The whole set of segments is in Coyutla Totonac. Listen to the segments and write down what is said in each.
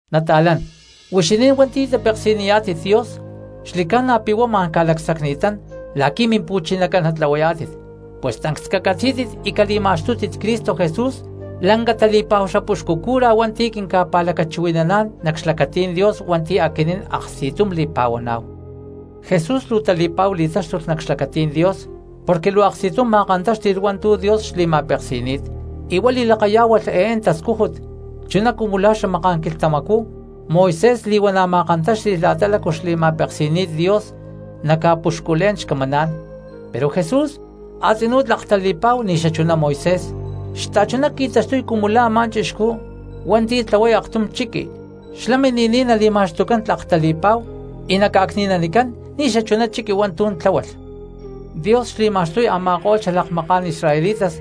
Nata̠lán, huixinín hua̠nti̠ tapeksi̠niyá̠tit Dios xli̠ca̠na pi̠ huá ma̠n ca̠lacsacni̠tán la̠qui̠ Mimpu̠chinacán natlahuayá̠tit, pus tancs cacatzí̠tit y cali̠ma̠xtútit Cristo Jesús cumu la̠ lanca tali̠pa̠hu xapuxcu cura hua̠nti̠ quinca̠pa̠lacachuhui̠naná̠n nac xlacatí̠n Dios hua̠nti̠ aquinín aksti̠tum li̠pa̠huaná̠hu. Jesús luu tali̠pa̠hu li̠táxtulh nac xlacatí̠n Dios porque luu aksti̠tum ma̠kantáxti̠lh hua̠ntu̠ Dios xli̠ma̠peksi̠ni̠t y huá li̠lakayá̠hualh eé xtascújut, chuná cumu la̠ xamaká̠n quilhtamacú Moisés li̠huana̠ ma̠kantáxti̠lh la̠ta lácu xli̠ma̠peski̠ni̠t Dios naca̠puxculé̠n xcamaná̠n. Pero Jesús a̠tzinú tlak tali̠pa̠hu ni̠ xachuná Moisés, xta̠chuná qui̠taxtuy cumu la̠ a̠má chixcú hua̠nti̠ tlahuay aktum chiqui xlá mini̠niy nali̠ma̠xtucán tlak tali̠pa̠hu y naca̠cni̠nanicán ni̠ xachuná chiqui hua̠ntu̠ tláhualh. Dios xli̠ma̠xtuy a̠ma̠ko̠lh xalakmaká̠n israelitas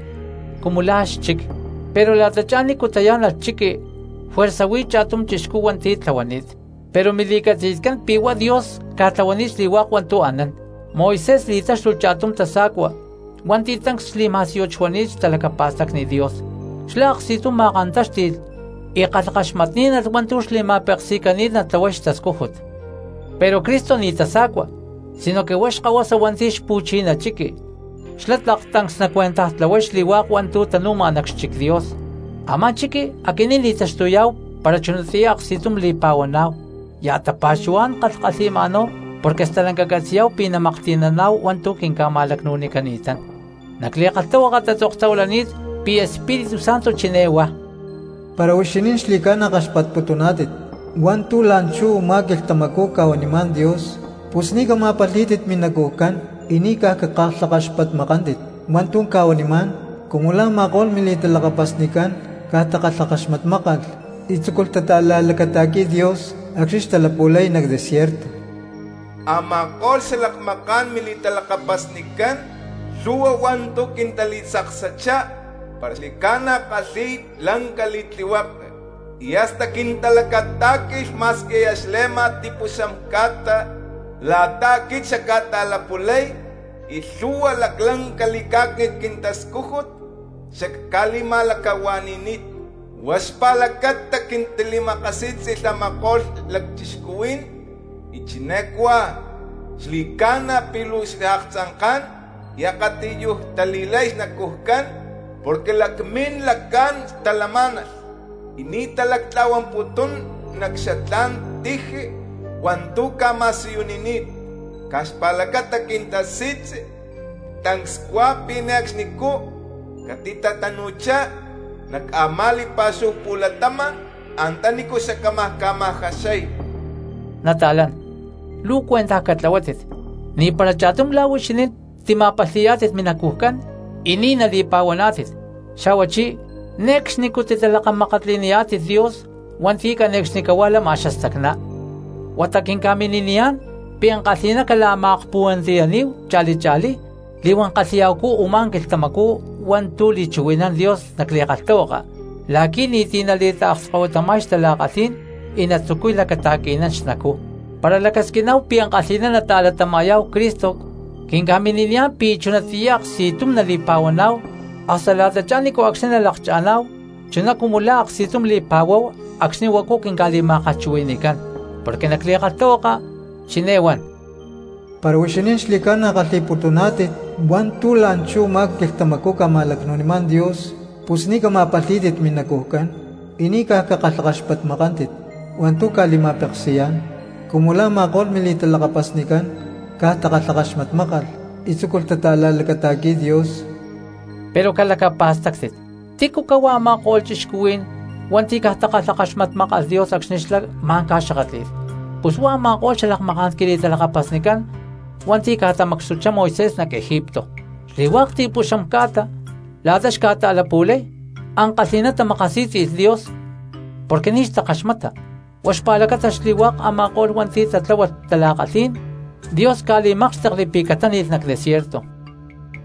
cumu lá xchic, pero la̠tachá nícu tayá̠nalh chiqui juerza huí cha̠tum chixcú hua̠nti̠ tlahuani̠t, pero mili̠catzi̠tcán pi̠ huá Dios ca̠tlahuani̠t xli̠hua̠k hua̠ntu̠ anán. Moisés li̠táxtulh cha̠tum tasa̠cua hua̠nti̠ tancs xli̠ma̠síyut xuani̠t xtalacapa̠stacni Dios, xlá aksti̠tum ma̠kantáxti̠lh y kalhakaxmatní̠nalh hua̠ntu̠ xli̠ma̠peksi̠cani̠t natlahuay xtascújut. Pero Cristo ni̠ tasa̠cua sinoque huá xkahuasa hua̠nti̠ xpu̠chiná chiqui, xlá tlak tancs nacuentajtlahuay xli̠hua̠k hua̠ntu̠ tanúma nac xchic Dios, a̠má chiqui aquinín li̠taxtuyá̠hu para chunatiyá aksti̠tum li̠pa̠huaná̠hu, ya̠ tapa̠xuhuá̠n kalhkalhi̠ma̠náhu porque stalanca catzi̠yá̠hu pi̠ namaklhti̠naná̠hu hua̠ntu̠ quinca̠ma̠lacnu̠nicani̠tán. Nac li̠kalhtahuaka tatzoktahuilani̠t pi̠ Espíritu Santo chiné huá: Para huixinín xli̠ca̠na kaxpatputuná̠tit hua̠ntu̠ la̠nchú u̠má quilhtamacú ca̠huanimá̠n Dios, pus ni̠ cama̠palhí̠tit minacujcán y ni̠ caj cakalhakaxpatmakántit wa̠ntu̠ cca̠wanimá̠n cumu la̠ a̠ma̠ko̠lh mili̠talakapasnicán caj takalhakaxmatmákalh y tzúculh tata̠la̠lacata̠qui̠y Dios acxni̠ xtalapu̠lay nac desierto. Ama̠ko̠lh xalakmaká̠n mili̠talakapasnicán lhu̠hua hua̠ntu̠ quintali̠tzaksachá para xli̠ca̠na ckalhi̠y lanca li̠tlihueke, y hasta quintalacatá̠qui̠lh ma̠squi aya xle̠ma xli̠ti̠puxam ca̠ta la̠ta aquit xacca̠ta̠lapu̠lay, y lhu̠hua laclanca li̠cá̠cni̠t quintascújut xacca̠li̠ma̠lacahua̠ni̠ni̠t. Huá xpa̠lacata quintali̠makasí̠tzi̠lh a̠ma̠ko̠lh cristianos, y chiné cuá: “Xli̠ca̠na pi̠ luu xaaktzanká̠n y akatiyuj tali̠lay xnacujcán, porque lacmín lacán talamá̠nalh y ni̠ talactla̠huamputún nac xatlá̠n tiji hua̠ntu̠ cca̠ma̠siyunini̠t.” Caj xpa̠lacata quintasi̠tzi tancs cuá pi̠ ne̠cxnicú catitatanu̠chá nac a̠má li̠pa̠xúhu pu̠latama̠n antanícu xacámaj ca̠ma̠jaxay. Nata̠lán, luu cuentaj catlahuátit ni̠para cha̠tum lá huixinín tima̠palhi̠yá̠tit minacujcán y ni̠ nali̠pa̠huaná̠tit, xa̠huachí ne̠cxnicú titalakamakatli̠niyá̠tit Dios hua̠nti̠ cane̠cxnicahuá lama xastacná. Huata quinca̠mini̠niyá̠n pi̠ ankalhi̠ná cala̠ma̠akpuhuantiyaní̠hu cha̠li cha̠lí li̠huán kalhi̠ya̠hucú “u̠má quilhtamacú” hua̠ntu̠ li̠chuhui̠nán Dios nac li̠kalhtahuaka la̠qui̠ ni̠ti̠ nali̠taakskahuitama̠y xtala̠kalhí̠n y natzucuy lacata̠qui̠nán xnacú. Para lacasquiná̠hu pi̠ ankalhi̠ná nata̠latama̠yá̠hu Cristo quinca̠mini̠niyá̠n pi̠ chunatiyá aksti̠tum nali̠pa̠huaná̠hu hasta la̠tachá ni̠nco̠cxni nalakcha̠ná̠hu chuná cumu la̠ aksti̠tum li̠pa̠huáhu acxni̠ huacu quinca̠li̠ma̠kalhchuhui̠ni̠cán. Porque nac li̠kalhtahuaka chiné huan: Para huixinín xli̠ca̠na kalhi̠putuná̠tit hua̠ntu̠ la̠nchú u̠má quilhtamacú ca̠ma̠lacnu̠nimá̠n Dios, pus ni̠ cama̠palhí̠tit minacujcán y ni̠ caj cakalhakaxpatmakántit hua̠ntu̠ ca̠li̠ma̠peksi̠yá̠n, cumu la̠ a̠ma̠ko̠lh mili̠talakapasnicán caj takalhakaxmatmákalh y tzúculh tata̠la̠lacata̠qui̠y Dios. Pero calacapa̠stáctit, ¿tícu cahuá a̠ma̠ko̠lh cristianos hua̠nti̠ caj takalhakaxmatmákalh Dios acxni̠ xlá ma̠n ca̠xakátli̠lh? Pus huá a̠ma̠ko̠lh xalakmaká̠n quili̠talakapasnicán hua̠nti̠ ca̠tamacxtuchá Moisés nac Egipto. Xli̠hua̠k ti̠puxam ca̠ta la̠ta xca̠ta̠lapu̠lay, ankalhi̠ná tamakasí̠tzi̠lh Dios porque ni̠ xtakaxmata, huá xpa̠lacata xli̠hua̠k a̠ma̠ko̠lh hua̠nti̠ tatláhualh tala̠kalhí̠n Dios ca̠li̠mákxtekli pi̠ catáni̠lh nac desierto.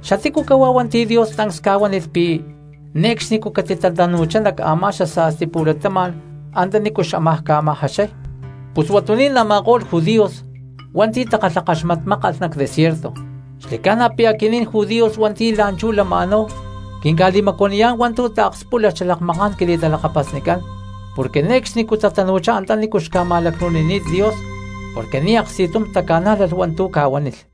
¿Xatícu cahuá hua̠nti̠ Dios tancs ca̠huánilh pi̠ ne̠cxnicú catitatanu̠chá nac a̠má xasa̠sti pu̠latama̠n antanícu xámaj ca̠ma̠jaxay? Pus huatuní̠n a̠ma̠ko̠lh judíos hua̠nti̠ takalhakaxmatmákalh nac desierto. Xli̠ca̠na pi̠ aquinín judíos hua̠nti̠ la̠nchú lama̠náhu quinca̠li̠macuaniyá̠n hua̠ntu̠ taakspúlalh xalakmaká̠n quili̠talakapasnicán porque ne̠cxnicú tatanu̠chá antanícu xca̠ma̠lacnu̠níy Dios porque ni̠ aksti̠tum taca̠nájlalh hua̠ntu̠ ca̠huánilh.